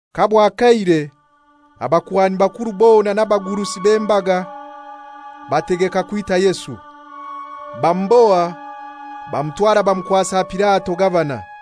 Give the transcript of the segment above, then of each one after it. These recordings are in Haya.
Kabwakeire abakuhani bakuru bona n'abagurusi b'embaga bategeka kwita Yesu. Bamuboha bamutwara bamukwasa Pilato, gavana.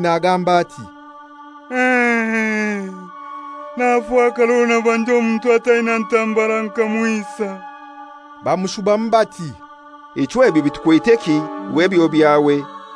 nagamba ati, «Nafakara orwo nabanja omuntu ataina ntambara nkamwisa.» Bamushubamu bati, «Ichwe ebyo bitukweteki? Iwe ebyo byawe.»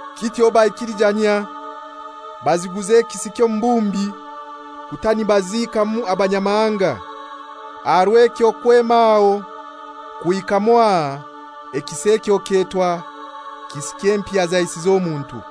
Kityo baikilijanyia, baziguza ekisi ky'omubumbi, kuta nibaziikamu abanyamahanga. Aha rw'ekyo kwema aho kuhika mwaha ekisi ekyo kyetwa, «Kisi ky'empiha zaisize omuntu.»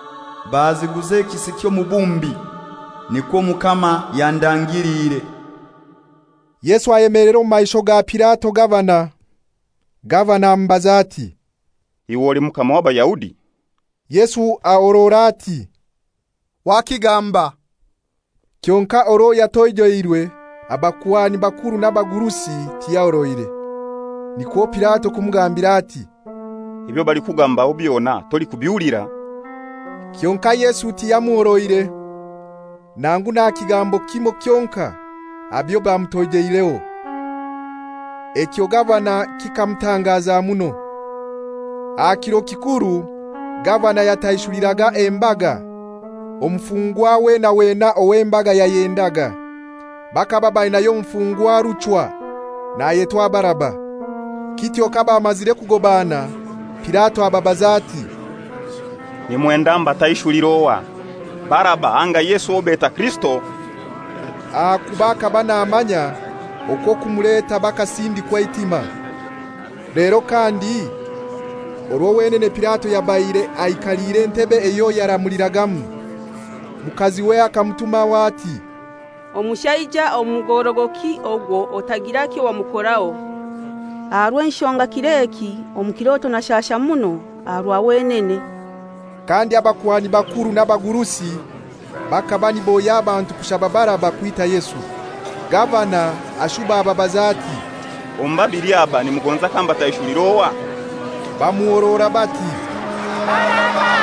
baziguza ekisi ky'omubumbi, nikwo Omukama yandagiliire.» Yesu ayemelera omu maisho ga Pilato gavana. Gavana amubaza ati, «Iwe oli Mukama w'Abayahudi?» Yesu ahorora ati, «Wakigamba.» Kyonkai orwo yatoijeirwe abakuhani bakuru n'abagurusi tiyahoroire. Nikwo Pilato kumugambira ati, «Ebyo balikukugambaho byona tolikubihulira?» Kyonkai Yesu tiyamuhoroire, nangu n'aha kigambo kimoi kyonkai aha byobamutoijeireho. Ekyo gavana kikamutangaza muno. Aha kiro kikuru gavana yataishuliraga embaga omufungwa wena wena ow'embaga yayendaga. Bakaba bainayo omufungwa ruchwa nayetwa Baraba. Kityo kabamazire kugobana Pilato ababaza ati, «Nimwenda mbataishulire ohai, Baraba anga Yesu owo beta Kirisito?» Ahakuba akaba namanya okwo okumuleta bakasindikwa eitima. Lero kandi orwo wenene Pilato yabaire aikaliire entebe eyo yaramuliragamu, mukaziwe akamutumaho ati, «Omushaija omugorogoki ogwo otagira kyowamukoraho, aha rw'enshonga kir'eki omu kiroto nashasha muno aha rwa wenene.» Kandi abakuhani bakuru n'abagurusi bakaba niboohya abantu kushaba Baraba, kwita Yesu. Gavana ashuba ababaza ati, «Omu babili aba nimugonza kambataishulira ohai?» Bamuhorora bati, «Baraba.»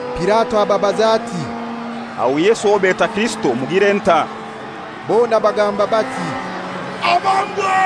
Pilato ababaza ati, «Aho Yesu owo beta Kirisito mugire ntai?» Bona bagamba bati, «Abambwe.»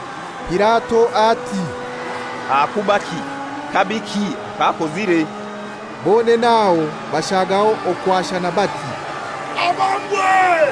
Pilato ati, «Ahakubaki? Kabiki ak'akozire?» Bonene aho bashagaho okwashana bati, «Abambwe.»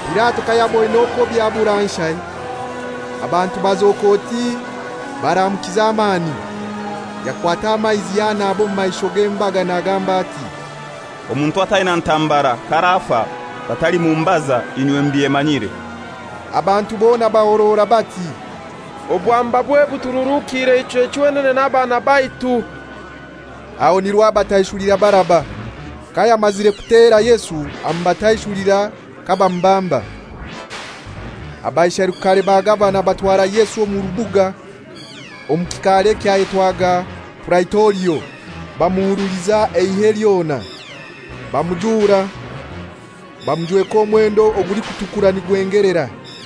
Pilato kayaboine okwo byabura nshai, abantu bazoka oti baramukiza amani, yakwata amaizi yanaba omu maisho g'embaga nagamba ati, «Omuntu ataina ntambara k'arafa batalimumbaza, inywe mubyemanyire.» Abantu bona bahorora bati, «Obwambabwe butururuukire ichwe chwenene n'abaana baitu!» Aba nirwo abataishulira Baraba. Kayamazire kutera Yesu amubataishulira kabamubamba. Abaisherukare ba gavana batwara Yesu omu rubuga omu kikaare ekyayetwaga Puraitorio, bamuhuruliza eihe lyona. Bamujuura, bamujweka omwendo ogulikutukura nigwengelera,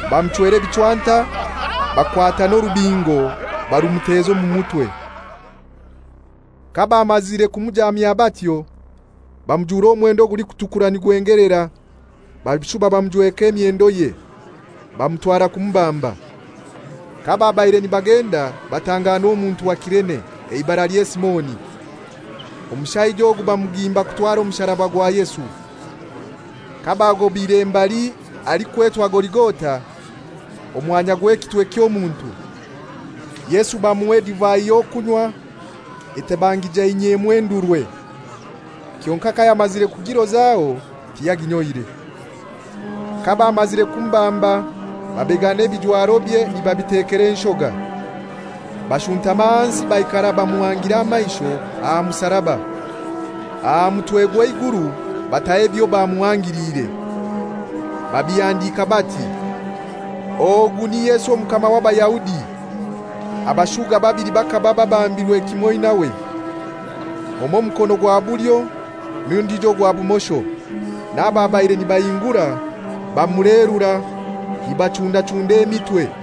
Bamuchwera ebichwanta, bakwata n'orubingo barumuteza omu mutwe. Kabamazire kumujaamya batyo bamujuura omwendo ogulikutukura nigwengelera, bashuba bamujweka emyendoye, bamutwara kumubamba. Kababaire nibagenda batanganwa omuntu wa Kirene, eibaralye Simoni. Omushaija ogu bamugimba kutwara omusaraba gwa Yesu. Kabagobire mbali halikwetwa Goligota (omwamya gw'ekitwe ky'omuntu), bamuha edivai y'okunywa, etabangijainyiemu endurwe, kyonkai kayamazire kugirozaho tiyaginyoire. Kabamazire kumubamba babegana ebijwarobye nibabitekera enshoga. Bashuntama ahansi baikara bamuhangire amaisho aha musaraba. Aha mutwegwe eiguru bataho ebyo bamuhangiliire, babihandika bati, «Ogu ni Yesu Omukama w'Abayahudi.» Abashuuga babili bakaba babambirwe kimoi nawe, omoi mukono gwa bulyo n'ondijo ogwa bumosho. N'ababaire nibahingura bamulerura nibachundachunda emitwe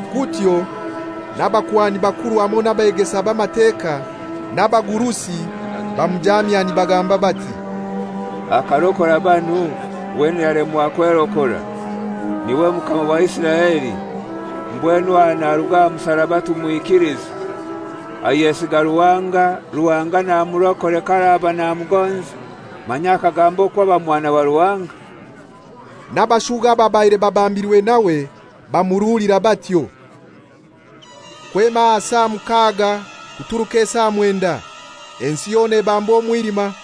Kutyo n'abakuhani bakuru hamoi n'ebegesa b'Amateka n'abagurusi bamujaamya nibagamba bati, «Akarokora banu wenene yalemwa kwerokora. Niwe Mukama wa Isiraeli; mbwenu aha naruge aha musaraba tumwikilize. Ayesiga Ruhanga, Ruhanga n'amurokore k'araba namugonza; manya akagamba okwo aba Mwana wa Ruhanga!» N'abashuga ababaire babambirwe nawe bamuruulira batyo. Kwema aha saa mukaga kuturuka esaa mwenda, ensi yona ebambwa omwilima.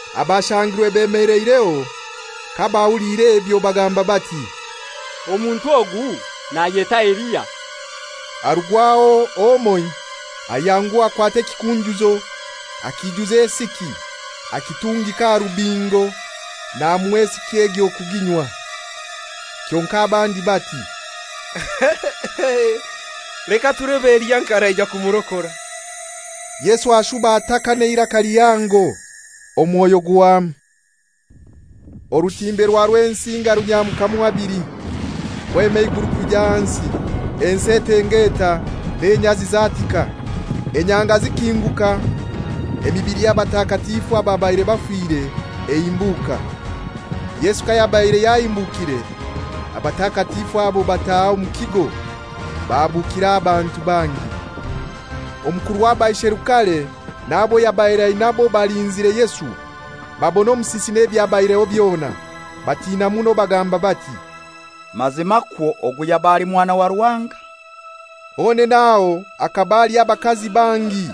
Abashangirwe bemeleireho kabahuliire ebyo bagamba bati, «Omuntu ogu nayeta Eliya.» Harugwaho omoi ayanguha akwata ekikunjuzo, akiijuza esiki, akitungika aha rubingo namuha esiki egyo kuginywa. Kyonkai abandi bati, «Leka tulebe Eliya nk'araija kumurokora.» Yesu ashuba ataka n'eiraka lihango, omwoyo guhwamu. Orutimbe rwa Rwensinga runyamukamu habili, kwema eiguru kwija ahansi. Ensi etengeeta n'enyazi zatika. Enyanga zikinguka, emibili y'abatakatifu ababaire bafire ehimbuuka. Yesu kayabaire yahimbukire abatakatifu abo bataha omu kigo bahabukira abantu bangi. Omukuru w'abaisherukare n'abo yabaire ainabo balinzire Yesu, babona omusisi n'ebyabaireho byona. Batina muno, bagamba bati, «Mazima kwo ogu yaba ali Mwana wa Ruhanga!» Honene aho hakaba haliho abakazi bangi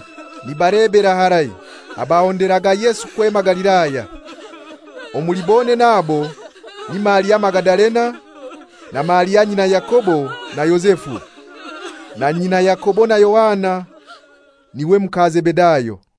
nibalebera harai, abahonderaga Yesu kwema Galilaya. Omuli bonene abo ni Maria Magadalena, na Maria nyina Yakobo na Yozefu, na nyina Yakobo na Yohana, niwe muka Zebedayo.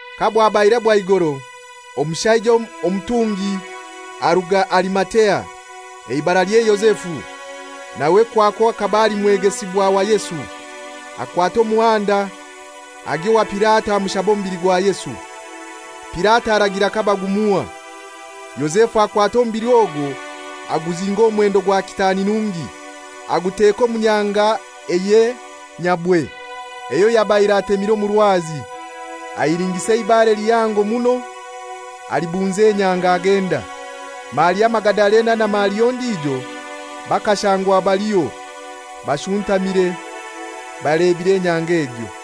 Kabwabaire bwaigoro, omushaija omutungi aruga Arimatea, eibaralye Yozefu, nawe kwakwo akaba ali mwegesibwa wa Yesu. Akwata omuhanda agya owa Pilato amushaba omubili gwa Yesu. Pilato aragira kabagumuha. Yozefu akwata omubili ogwo aguzinga omu mwendo gwa kitaani nungi, aguteeka omu nyanga eye nyabwe, eyo yabaire atemire omu rwazi. Ahilingisa eibare lihango muno alibunza enyanga, agenda. Maria Magadalena na Maria ondijo bakashangwa baliho, bashuntamire balebire enyanga egyo.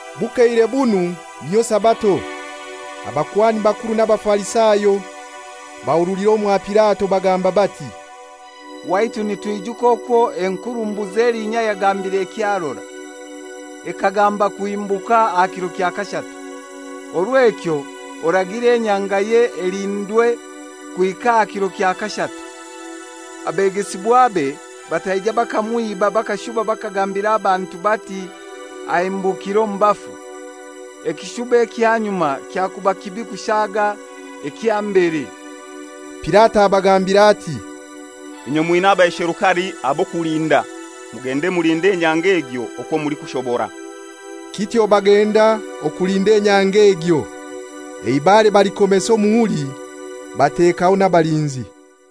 Bukeire bunu, niyo Sabato, abakuhani bakuru n'Abafarisayo bahurulira omwa Pilato bagamba bati, «Waitu nitwijuka okwo enkurumbuzi elinya yagambire ekyarora. Ekagamba kuhimbuka aha kiro kya kashatu. Orw'ekyo oragire enyangaye elindwe kuhika aha kiro kya kashatu, abegesibwabe bataija bakamwiba bakashuba bakagambira abantu bati, ‹Ahimbukire omu bafu.› Ekishuba ekya nyuma kyakuba kibi kushaga ekya mbere.» Pilato abagambira ati, «Inywe mwina abaisherukare ab'okulinda. Mugende mulinde enyanga egyo okwo mulikushobora.» Kityo bagenda, okulinda enyanga egyo eibare balikomesa omuhuri, batekaho n'abalinzi.